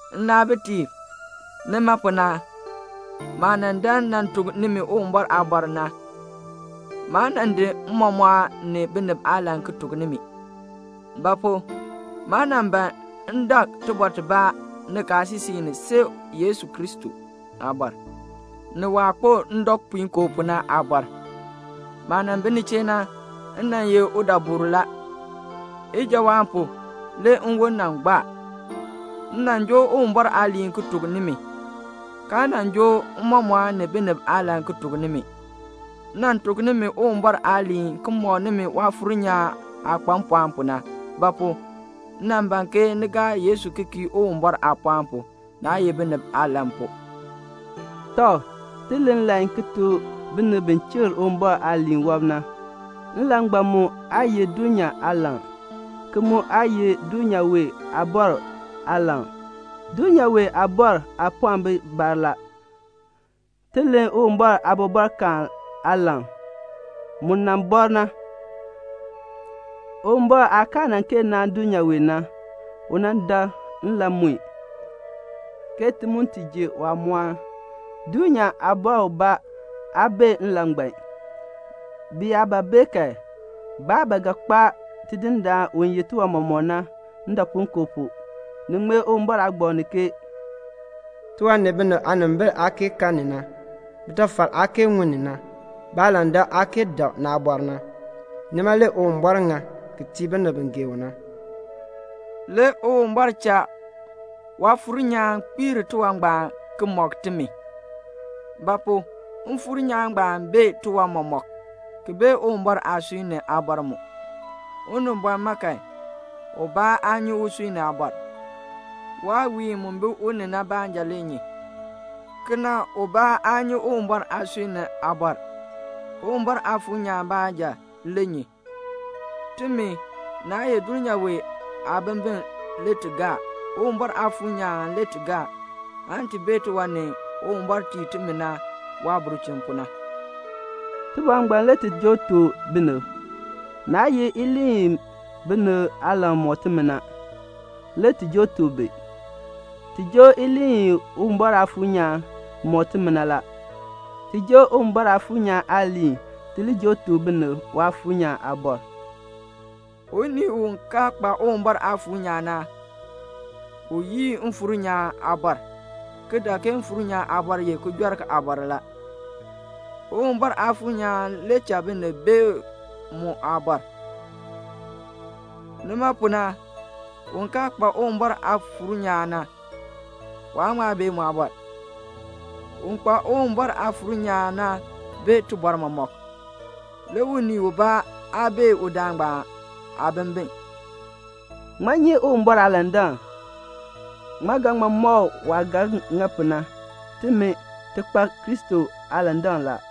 Nnaabitiib, nima pu na, maah nan dan nan tuk nimi Uwumbɔr aabɔr na, maa nan di mmɔmɔɔn ni binib aalan ki tuk nimi. Ba pu? maa nan ban m dak tibɔr tibaa nikaasisik ni see Yesu Kristo aabɔr, ni waah kpo ndɔpuinkoo pu na aabɔr. Maah nan bi ni chee na, m nan ye udabur la. Ijawaan pu, le nwon nan gbaar. M nan joo Uwumbɔr aaliin ki tuk nimi, kaa nan joo mmɔmɔɔn ni binib aalan ki tuk nimi. M nan tuk nimi Uwumbɔr aaliin ki mɔk nimi Waafuur nyaan aah kpa mpɔɔn pu na; ba pu? m nan ban ke ni gaa Yesu ki kii Uwumbɔr aapɔɔn pu, naa ye binib aalan pu. Tɔ, ti len nlan ki tuk binib bi chikr Uwumbɔr aaliin wɔb na. Nlan ngbaan mu aa ye dulnyaa aalan, ki mu aa ye dulnyaa wee aabɔrb aalan. Dulnyaa wee aabɔrb aapɔɔn bi bar la. Ti len Uwumbɔr aabɔbɔrkaan aalan, mu nan bɔr na. Uwumbɔr aah kaa nan kee naan dulnyaa wee na, u nan dakl nlan mue, ke ti mu ti ji waamɔɔn. Dulnyaa aabɔr ubaa aa bee nlan ngbaan. Bi yaa ba bee kan, baa ba ga kpaa Tidindaan u yeh tiwan mɔmɔk na, ndɔpuinkoo pu. Ni ŋmee Uwumbɔr aagbaŋ ni ke "Tiwan ni binib aanimbil aa kee kan ni na, bitafal aa kee ŋun ni na, baalandak aa kee dak naabɔr ni na, nima le Uwumbɔr ŋa ki tii binib bi gee u na." Le Uwumbɔr cha Waafuur nyaan kpiir tiwan ngbaan ki mɔk timi. Ba pu? Mfuur nyaan ngbaan bee tiwan mɔmɔk, ki bee Uwumbɔr aasui ni aabɔr mu. Unibɔn ma kan, ubaa aa nyi usui ni aabɔr. Waawiin mu bi u ni na baanja le nyi. Kena ubaa aa nyi Uwumbɔr aasui ni aabɔr. Uwumbɔr Aafuur nyaan baanja le nyi. Timi, naa ye dulnyaa wee aabimbin le ti gaa. Uwumbɔr Aafuur nyaan le ti gaa, aan ti bee tiwan ni Uwumbɔr tii timi na waabulchin pu na. Tibɔr ngbaan le ti joo tuk binib. Naa ye iliin i binib aalan mɔk timi na, le ti joo tuk bi. Ti joo iliin i Uwumbɔr Aafuur nyaan mɔk timi na la. Ti joo Uwumbɔr Aafuur nyaan aaliin ti li tuk binib Waafuur nyaan aabɔr. Unii u kaa kpa Uwumbɔr Aafuur nyaan na, u yii Mfuur nyaan aabɔr, ki dak ke Mfuur nyaan aabɔr ye kijɔrk aabɔr la. Uwumbɔr Aafuur nyaan le cha binib bee mu aabɔr. Nima pu na, un kaa kpa Uwumbɔr aafuur nyaan na, waa ŋma bee mu aabɔr. Un kpa Uwumbɔr Aafuur nyaan na bee tibɔr mɔmɔk, le unii ubaa aa bee udaan ngbaan aabimbin. Ŋmaa nyi Uwumbɔr aalandak? Ŋmaa ga ŋma mɔk u waah ga ŋa pu na? Timi, ti kpa Kristo aalandak la.